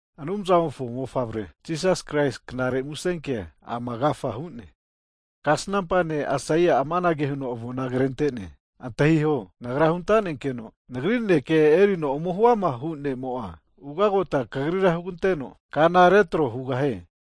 Anumzamofo Mofavre Jisas Kraisi knare musenkea ama agafa hu'ne. Kasnampa ne' Aisaia amanage huno avona krentene, Antahiho, nagra huntanenkeno nagri naneke erino ome huamahu ne'mo'a ugagota kagrira huganteno, kana retro hugahie.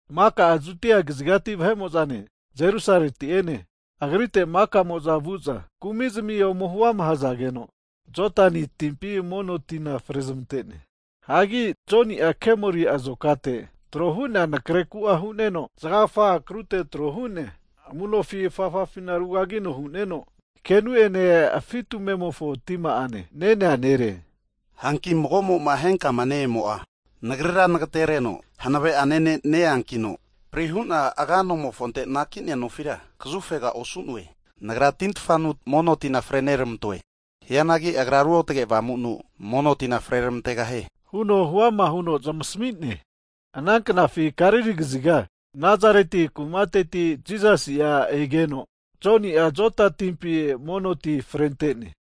Maka Judia kazigati vahe'mo'zane Jerusaleti'ene, agrite maka'mo'za vu'za huama kumizmia ome hazageno, Jodani timpina mono tina frezmante'ne. Hagi Joni'a kemori azokate tro hu'nea anakre ku'a hu'neno, zgagfa akruteti tro hu'nea amu nofi afafafi rugagino hu'neno, kenu ene afi' tumemofo tima'ane nenea nere. Hanki mago'ma henkama ne-emo'a nagrira nagetereno hanave'ane ne' neankina, prihu'na aga anomofonte anakinea nofira kazufega osu'noe. Nagra tintfanu mono tina freneramantoe. Hianagi Agra Ruotge Avamunu, mono tina freramantegahie, huno huama huno zmasamine. Ana knafi Galili kaziga Nazareti kumateti Jisasi'a egeno, Joni'a Joda timpi mono ti frentene.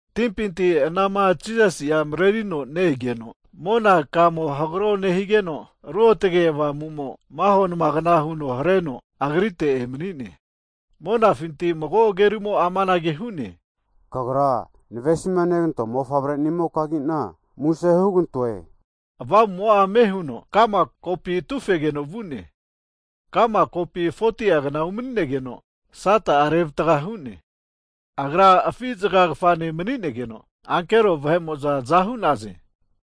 Timpinti anama Jisasi'a marerino ne-egeno, mona kamo hagro nehigeno Ruotge Avamumo maho namagna huno hareno Agrite emanine. Monafinti mago agerumo amanage hu'ne, Kagra navesimanegantoa mofavre'nimokagina muse hugantoe. Avamumo'a ame huno ka'ma kopi atufegeno vu'ne. Ka'ma kopi 40ti'a kna umani'negeno, Sata'a revatga hu'ne. Agra afizga kfane maninegeno, ankero vahe'mo'za aza hu'naze.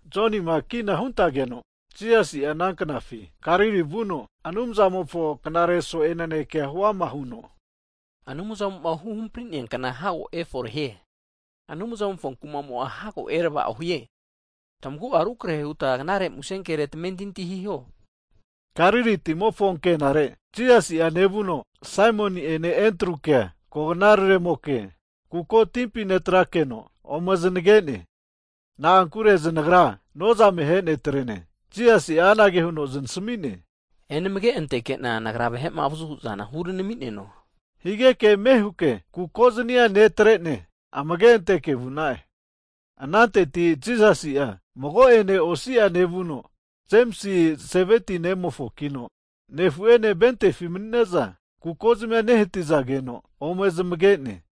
Jonima kina huntageno, Jisasi'a ana knafi Galili vuno Anumzamofo knare so'e naneke huama huno, Anumzamo'ma huhampri'nea kna hago eforehie. Anumzamofo kumamo'a hago eravao hie. Tamagu'a rukrahe huta knare musenkere tamentinti hiho. Galili timofo ankenare Jisasi'a nevuno Saimoni'ene Endrukea, koganararemoke, kuko timpi netrakeno ome znagene. Na'ankure znagra nozame ahe ne'trene. Jisasi'a anage huno znasami'ne, enamage antenkena, Nagra vahe'ma avazu hu'zana huranami'neno. Higeke ame huke kuko zani'a netre'ne amage anteke vu'na'e. Ananteti Jisasi'a mago'ene osi'a nevuno, Jemisi Zebeti nemofokino nefu'ene ventefi mani'ne'za kukozamia nehatizageno ome zamage'ne.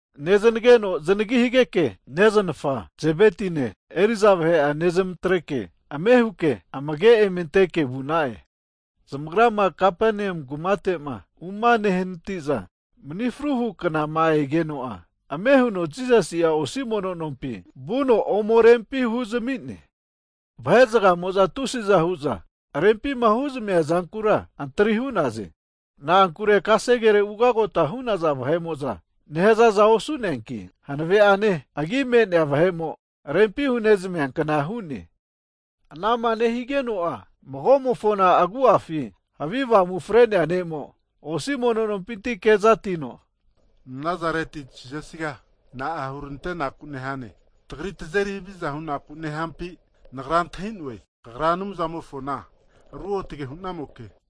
Neznageno zanagi higeke, neznafa Zebetine eriza vahe'a nezmatreke ame huke amage eme ante'ne vu'na'e. Zamagrama Kapanea kumate'ma umahanatite'za, mni fruhu knama egeno'a ame huno Jisasi'a osi mono nompi vuno rempi ome huzami'ne. Vahe zagamo'za tusiza hu'za rempima huzamia zankura antri hu'naze. Na'ankure kasegere ugagota hu'naza vahe'moza nehazaza osu'neanki, hanave'ane agi me'nea vahe'mo rempi hu'nezamiakna hu'ne. Anama nehigeno'a mago'mofona agu'afi havi avamu fre'nea ne'mo osi mono nompinti kezatino, Nazareti Jisasiga na'a hurantenaku nehane? Tagri tazeri haviza hunaku neampi? Nagra antahi'noe, Kagra Anumzamofona Ruotge hunamoke.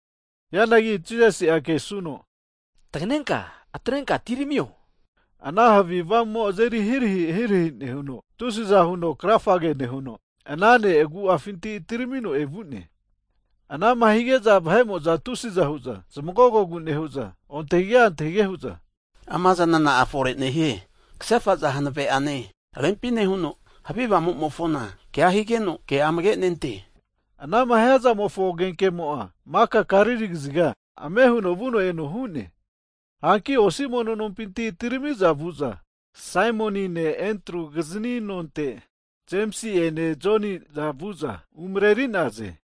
Hianagi Jisasi'a kesuno, taganenka atrenka atiramio! Ana havi avamumo azeri hirahi hirahi nehuno, tusiza huno krafage nehuno ana ne' agu'afinti atiramino evu'ne. Ana'ma higeza vahe'mo'za tusiza hu'za zmagogogu nehu'za, ontahige antahige hu'za, amazana na'a fore nehie, kahefaza hanave'ane rempi nehuno, havi avamumofona kea higeno ke'a amage nente. Anama hiazamofo agenkemo'a maka Galili kaziga ame huno vuno eno hu'ne. Hanki osi mono nompinti' atirami'za Saimonine Endru kizini nonte Jemisi'ene Joniza vu'za umareri'naze.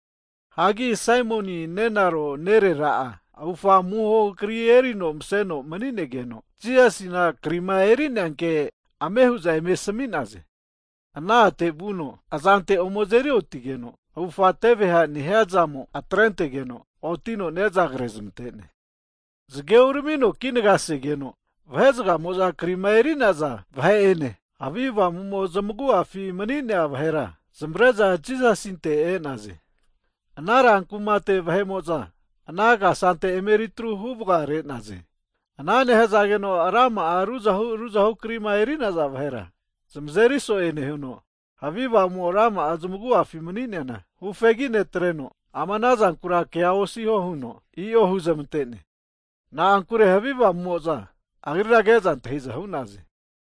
Hagi Saimoni nenaro nerera'a avufa amuhohu kri erino maseno maninegeno, Jisasina krima eri'nea kea ame hu'za ome asami'naze. Ana a'te vuno azante ome azerioti'geno, avufga teveha nehiazamo atrentegeno, otino ne'za krezamante'ne. Zage uramino kinagasegeno, vahe'zgamo'za krima eri'naza vahe'ene, havi avamu zamagu'afi mani'nea vahera zamavre'za Jisasinte e'naze. Ana rankumate vahe'mo'za ana kasante eme eritru huvgare'naze. Ana nehazageno rama'a ruzahu ruzahu krima eri'naza vahera zmazeri so'e nehuno, havi avamu rama'a zmagu'afi mani'neana hufegi netreno, ama anazankura kea osiho huno i'o huzmantene. Na'ankure havi avamumo'za Agrira keza antahiza hu'naze.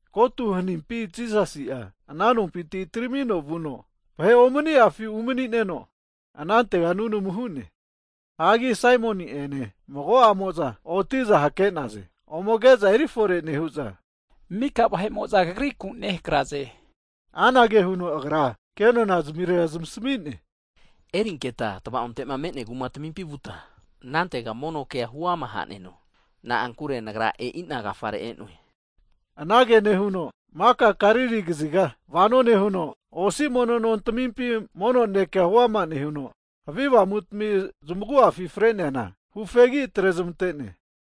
Kotu hanimpi Jisasi ana nompinti atiramino vuno vahe omani'afi umani'neno, anantega nunamu hu'ne. Hagi Saimoni ene mago'amo'za oti'za hake'naze. Ome age'za erifore nehu'za, mika vahe'mo'za kagriku nehakraze hu'za asami'naze. Anage huno Agra kenona zmirera zamasmi'ne, erinketa tava'ontema me'nea kumatamimpi vuta, anantega mono kea huama haneno. Na'ankure nagra e'ina agafare e'noe. Anage nehuno maka Galili kaziga vano nehuno, osi mono nontamimpi mono naneke huama nehuno, havi avamutmi zamagu'afi freneana hufegi atrezmante'ne.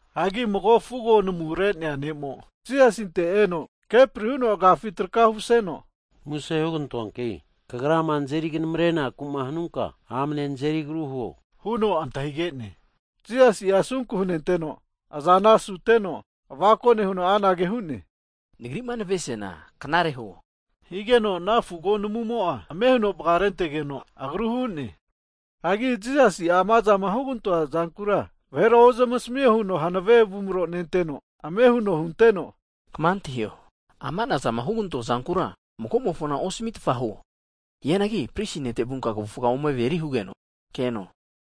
Hagi mago fugo namurenea ne'mo Jisasinte eno kepri huno agiafi traka humaseno, muse hugantoanki Kagrama nazeri knamrenaku hanunka, amne nazeri agru huo, huno antahigene. Jisasi'a asunku hunenteno, azana asuteno avako nehuno anage hu'ne, Nagri'ma navesiana knare huo! Higeno, ana fugo namumo'a ame huno vgarentegeno agru hu'ne. Hanki Jisasi'a amazama hugantoazankura vahera ozamasamio huno hanave avumro nenteno, ame huno hunteno, Kma antahio, ama'nazama hugantoa zankura mago'mofona osamitfa huo. Hianagi prisi nete vunka kavufga ome averi hugeno keno.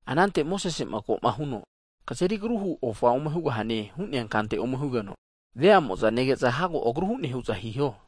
Anante Mosese'ma ko'ma huno kazeri agrumahu ofa ome hugahane hu'nea kante ome hugeno, veamo'za nege'za hago agru hu'ne hu'za hiho.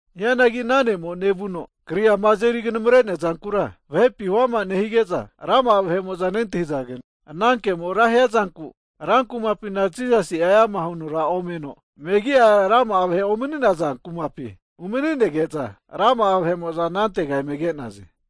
Hianagi ana ne'mo nevuno, kri'ama azeri knamare neazankura vahepi huama nehige'za, rama'a vahe'mo'za nentahizageno, ana kemo'a ra hiazanku, rankumapina Jisasi'a eamara huno omeno, megia rama'a vahera omani'naza kumapi umaninege'za rama'a vahe'mo'za anantega eme ke'naze.